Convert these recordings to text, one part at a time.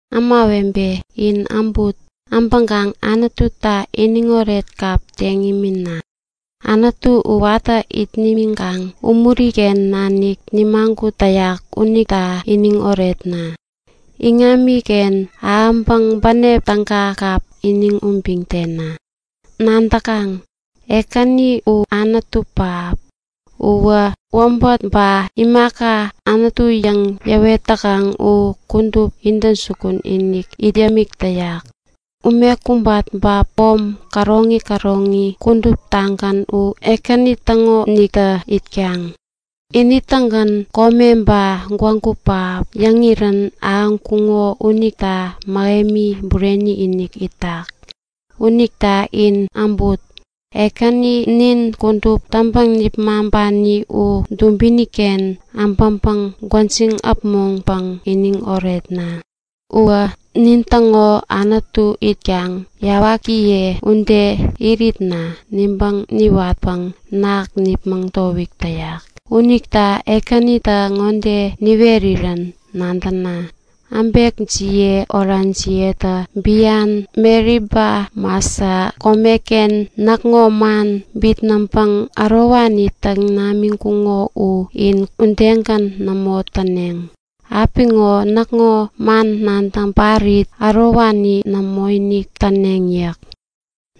Ämawebe, in äbut! Äbäkaŋ Anututa iniŋoret kap teŋ imina! Anutu u watä it nimiŋkaŋ umuri-ken nanik nimagut täyak unita iniŋ oretna! Iŋamiken ahäŋpäŋ bänep täga kap iniŋ ubiŋ tena! Nadäkaŋ? Ekäni u Anutu pähap. Uwä wäbät ba imaka anutu yäŋ yäwet täkaŋ u kudup intäjukun-inik it yämik täyak. Ume kubat ba pom käroŋi käroŋi kuduptagän u Ekäni täŋoniktä itkaŋ. Ini-tägän kome ba gwägu pähap yäŋirän ahäŋkuŋo unita mähemi bureni-inik itak. Unita in äbut! Ekäni nin kudup täŋpäŋ-nipmaŋpani u dubiniken äbäŋpäŋ gwäjiŋ äpmoŋpäŋ iniŋ oretna! Uwä nintäŋo Anutu itkaŋ yawakiye ude iritna nibäŋ niwatpäŋ ketem nipmäŋ towik täyak. Unita Ekänitä ŋode niwerirän nadäna; Äbekjiye orajiyetä bian Meriba Masa komeken näkŋo man bitnäŋpäŋ ärowani täk täŋkuŋo u in udegän nämo täneŋ. Apiŋo näkŋo man nadäŋ parit ärowani nämoinik täneŋ yäk.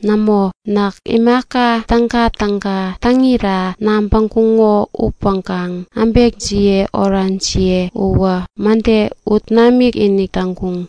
Nämo! Näk imaka tägatäga täŋira yabäŋkuŋo upäŋkaŋ äbekjiye orajiye uwä mäde ut namikinik täŋkuŋ.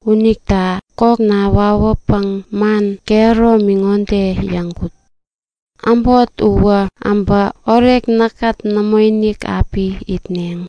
Unita kokna wawäpäŋ man kehäromi ŋode yäŋkut; Äbot uwä äbä orek näkkät nämoinik api itneŋ.